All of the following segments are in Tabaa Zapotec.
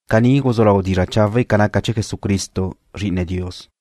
Caní guzú lau dizra' chawe' ca naca chee̱ Jesucristo, Zri'ine Dios.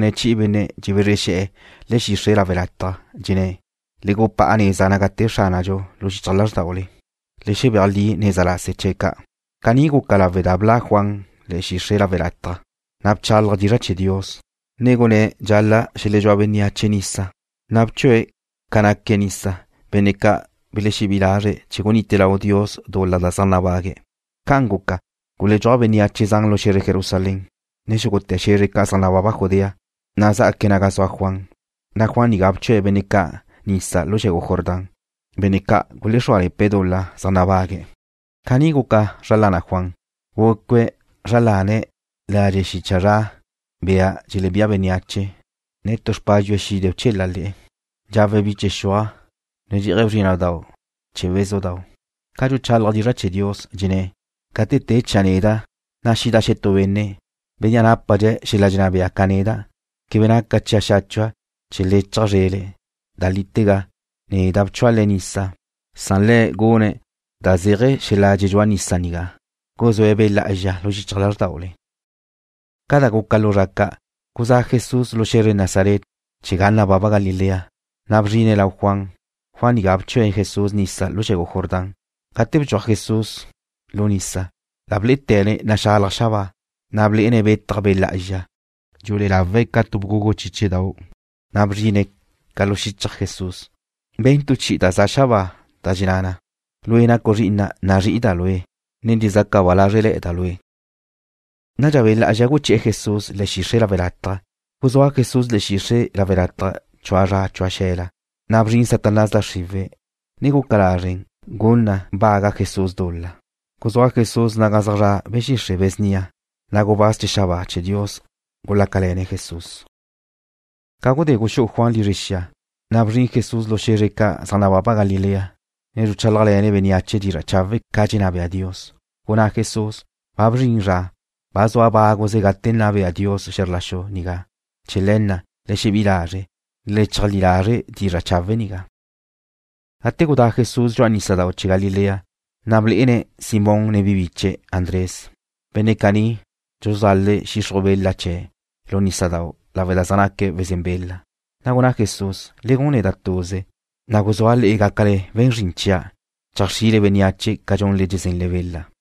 Welénqueze chi'i benne' dxebezre xe̱'e̱ le̱'e̱ xixre' lawe' lataj. Dxenné̱': “Le gupá'a neza naga te Xránadxu lu xichaj lázrdaule. Le xebéaj li neza lase chee̱' ca'.” Caní guca lawe' da bla' Juan le̱'e̱ xixre' lawe' lataj, na' bchálaje̱' dizra' chee̱ Dios, ne gunné̱' dxal-la' xeledxúa bénneache nisa, na' bchue̱' le̱' nisa, benne' ca' belexebí'i lazre̱' chee̱ gunite lau Dios dul-la da zaj nabague'. Ca'an guca, guledxúaj bénneache zan lu xe̱zre Jerusalén, ne xúgute̱ xe̱zre ca' zaj nababa Judea, na' xjaque̱' naga zua Juan, na' Juan nigá bchue̱' benne' ca' nisa lu xe̱gu Jordán, benne' ca' gulexrúale̱pe̱' dul-la da zaj nabague'. Caní guca zra lana Juan. Gucue̱' zra lane̱' ladxe' xicha zra camello, bia dxelebía bénneache, ne tu xpádxue̱' xide bchela le̱'e̱. Dxawe̱' biche xuaj, ne dxé'aje̱' bzrína'dau' chee̱ bézudau'. Ca dxuchálaje̱' dizra' chee̱ Dios, dxenné̱': ―Gate te chia' neda', na' xida xetú benne', bénnea' nápadxe̱' xel-la dxenná bea ca neda'. Quebe naca chia' xáchua' chee̱ lechja' zrele̱'. Da lítega, neda' bchua' le'e nisa. Le̱' gune̱' da zéaje̱ xel-la dxedxúa nisa nigá, guzúe̱' Be' Lá'azxa lu xichaj lázrdaule. Ca da guca lu zra ca', guzá' Jesús lu xe̱zre Nazaret chee̱ ga nababa Galilea, na' bzrine̱' lau Juan. Juan nigá bchue̱' Jesús nisa lu xe̱gu Jordán. Gate bdxuaj Jesús lu nisa, la blé'ete̱ne̱' naxalaj xabáa, ne blé'ene̱' betaj Be' Lá'azxa. Dxulé'e lawe̱' ca tu bgúgudu chiche, na' bzrine̱' ca li xichaj Jesús. Ben tu chi'i da za xabáa, da dxenná na: ―Lue' nacu' Zri'ina'. Nazrí'ida' Lue', ne dxezaca ba lázrele̱da' Lue'. Nadxa Be' Lá'azxa guché̱'e̱ Jesús le̱'e̱ xixre' lawe' lataj. Guzúa Jesús le̱'e̱ xixre' lawe' lataj chua zra chua xe̱la. Na' bzrin Satanás da xriwe̱', ne guca lazre' na gun na baga Jesús dul-la. Guzúa Jesús naga zaj zra' be̱ xixre' be̱ snia, na' gubáz chee̱ xabáa chee̱ Dios gulácale̱ne̱' Jesús. Ca gudé guxú'u Juan lizre xia, na' bzrin Jesús lu xe̱zre ca' zaj nababa Galilea, ne dxuchálajle̱ne̱' bénneache dizra' chawe' ca dxenná bea Dios. Gunná Jesús: ―Ba bzrin zra. Ba zua báguze gate nna bea Dios xe̱zr la xu nigá. Chee̱ le̱ na', le xebí'i lazre', ne le cheajlí lazre' dizra' chawe' nigá. Gate gudá Jesús dxu'a nísadau' chee̱ Galilea, na' blé'ene̱' Simón, ne Andrés, biche Simón na'. Benne' caní dxuluzale̱' xixruj bela chee̱' lu nísadau' lawe' da zaj naque̱' wezén bela. Na' gunná Jesús: ―Le gun neda' tuze, na' guzúa' le'e gácale we̱n zrin chia'. Cheajxrile bénneache ca dxunle dxezenle bela.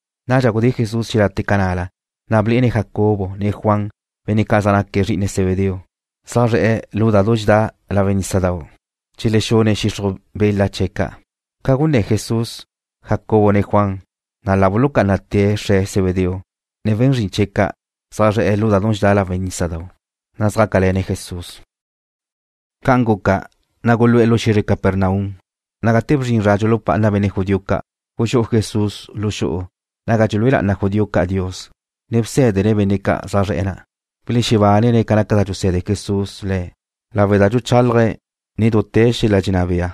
Nadxa gudé Jesús xelate' ca na'la, na' blé'ene̱' Jacobo, ne Juan, benne' ca' zaj naque̱' zri'ine Zebedeo. Zaj zre̱'e̱ lu da dxedá lawe' nísadau', dxelexexune̱' xixruj bela chee̱' ca'. Ca gunné̱ Jesús Jacobo, ne Juan, na' la bulucá'anate̱' xre̱' Zebedeo ne we̱n zrin chie̱' ca' zaj zre̱'e̱ lu da dxedá lawe' nísadau', na' zjácale̱ne̱' Jesús. Gate gul-la na gulu'e̱ lu xe̱zre Capernaum, na' gate bzrin zra dxulupá'ana benne' judío ca', guxú'u Jesús lu xu'u naga dxelúe lá'ana judío ca' Dios, ne bsé̱dene̱' benne' ca' zaj zre̱'e̱ na'. Belexebánene̱' ca naca da dxuse̱de Jesús le̱' lawe' da dxuchálaje̱' nen dute̱ xel-la dxenná bea,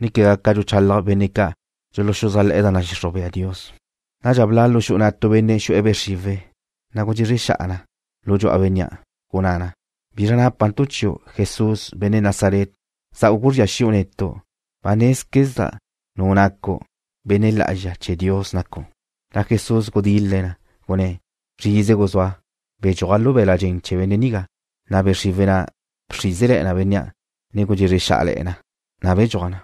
ne quegá ca dxuluchalaj benne' ca' dxuluxuzájle̱'e̱ da nadxixruj bea Dios. Nadxa bla' tu benne' xu'e̱ be' xriwe̱' lu xu'u na', na' gudxezre xa'a na lu dxu'a bénnea'. Gunná na: ―¿Bizra nápantu' chiu', Jesús, benne' Nazaret? ¿Za'u guzría xi'u netu'? Ba nézquezda' nu nacu'. Benne' Lá'azxa chee̱ Dios nacu'. Jesús gudil-le̱' na, gunné̱': ―Zrize guzúa. Bedxúaj lu be̱l-la' dxen chee̱ benne' nigá. Nadxa be' xriwe̱' na' bxrízele̱'e̱ na bénnea', ne gudxezre xá'ale̱'e̱ na, na' bedxúaj na.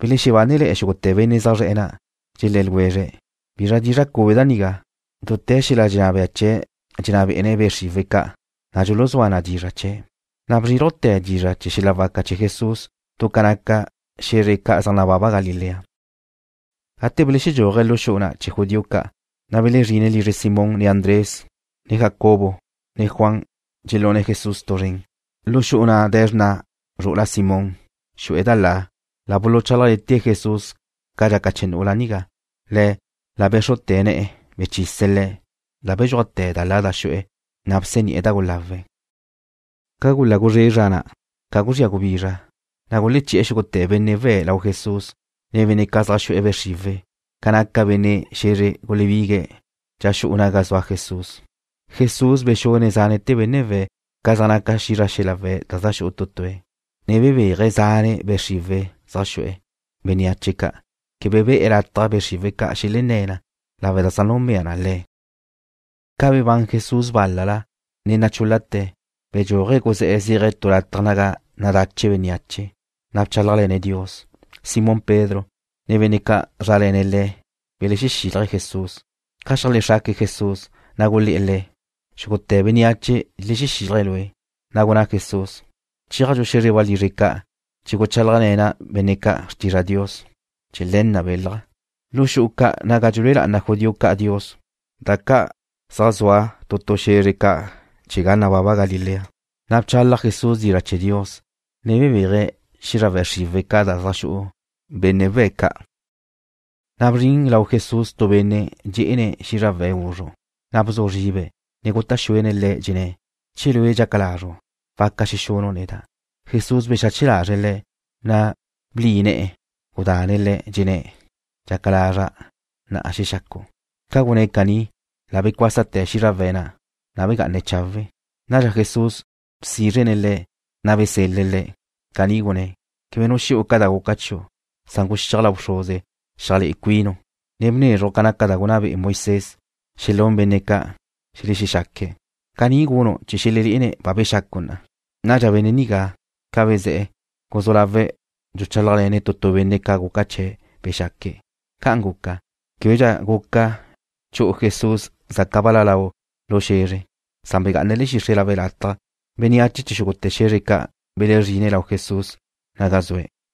Belexebánele̱'e̱ xúgute̱ benne' zaj zre̱'e̱ na', dxelé̱ ljwezre̱': ―¿Bizra dizra' cube da nigá? Dute̱ xel-la dxenná bea chee̱' dxenná be'ene̱' be' xriwe̱' ca', na' dxuluzúa na dizra' chee̱'. La bzrílujte̱ dizra' chee̱ xel-la waca chee̱ Jesús du ca naca xe̱zre ca' zaj nababa Galilea. Ca belexedxúaje̱' lu xu'u na' chee̱ judío ca', na' belezrine̱' lizre Simón, ne Andrés. Jacobo ne Juan dxelune̱' Jesús tu zren. Lu xu'u na' de̱ xrna' zru'ula Simón, xu'e̱ da la. La buluchálajle̱te̱' Jesús ca dxaca chee̱ nu'ula nigá. Le̱' la bé̱xrute̱' ne̱'e̱, bechise̱' le̱'. La bedxúajte̱ da la da xu'e̱, na' bseni'e̱ da gulawe̱'. Ca gula guzré zra na', ca guzría gubizra, na' guleché̱'e̱ xúgute̱ benne' we̱' lau Jesús, ne benne' ca' zaj xu'e̱ be' xriwe̱'. Ca naca benne' xe̱zre gulebigue̱' dxa xu'u naga zua Jesús. Jesús bexune̱' zánete̱ benne' we̱' ca zaj naca xízrawe̱' da xu'u tu tue̱', ne bebéaje̱' zane' be' xriwe̱' zaj xu'u bénneache ca'. Quebe be̱'e̱ lataj be' xriwe̱' ca' xelenné̱ na lawe' da zaj núnbea na Le̱'. Ca bebán Jesús bál-lala, ne nachúl-late̱, bedxúaje̱' guzé̱'e̱ zéaje̱' tu lataj naga nadache' bénneache, na' bchálajle̱ne̱' Dios. Simón Pedro, ne benne' ca' zaj zrále̱ne̱' le̱' belexexílaje̱' Jesús. Ca xeajlexraque̱' Jesús, na' gulé̱'e̱ Le̱': ―Xúgute̱ bénneache dxelexexílaje̱' Lue'. Na' gunná Jesús: ―Chéajdxu xe̱xre walizre ca' chee̱ guchálajle̱na' benne' ca' xrtizra Dios. Chee̱ le̱ na' belja'. Lu xu'u ca' naga dxelúe lá'ana judío ca' Dios, da ca' zaj zua tu tu xe̱zre ca' chee̱ ga nababa Galilea, bchalaj Jesús dizra' chee̱ Dios, ne bebéaje̱' xízrawe̱' xriwe̱' ca' da zaj xu'u benne' we̱' ca'. Nadxa bzrin lau Jesús tu benne' dxé'ene̱' xízrawe̱' guzru', na' bzu zribe̱', ne guta' xuene̱' Le̱', dxenné̱': ―Che Lue' dxaca lazru', waca xexunu' neda'. Jesús bexache lazre̱' le̱', na' bli ne̱'e̱, gudane̱' le̱'. Dxenné̱': ―Dxaca lazra'. Na'a dxexacu'. Ca gunné̱' caní, la becuásate̱ xízrawe̱' na', na' begá'ane̱' chawe'. Nadxa Jesús bsízrene̱' le̱', na' besel-le̱' le̱'. Caní gunné̱': ―Quebe nu xu'u ca da guca chiu'. Guxíaj lau bxruze xeajlé'e cuinu', ne bnezruj ca naca da gunná be'e Moisés xelún benne' ca' xelexexaque̱'. Caní gunu' chee̱ xelelé'ene̱' ba bexacu' na'a. Nadxa benne' nigá, ca bezé̱'e̱, guzú lawe̱' dxuchálajle̱ne̱' tu tu benne' ca guca chee̱' bexaque̱'. Ca'an guca, québedxa guca chu'u Jesús zaca bal-la lau lu xe̱zre. Begá'ane̱' le̱'e̱ xixre' lawe' lataj. Bénneache chee̱ xúgute̱ xe̱zre ca' belezrine̱' lau Jesús naga zue̱'.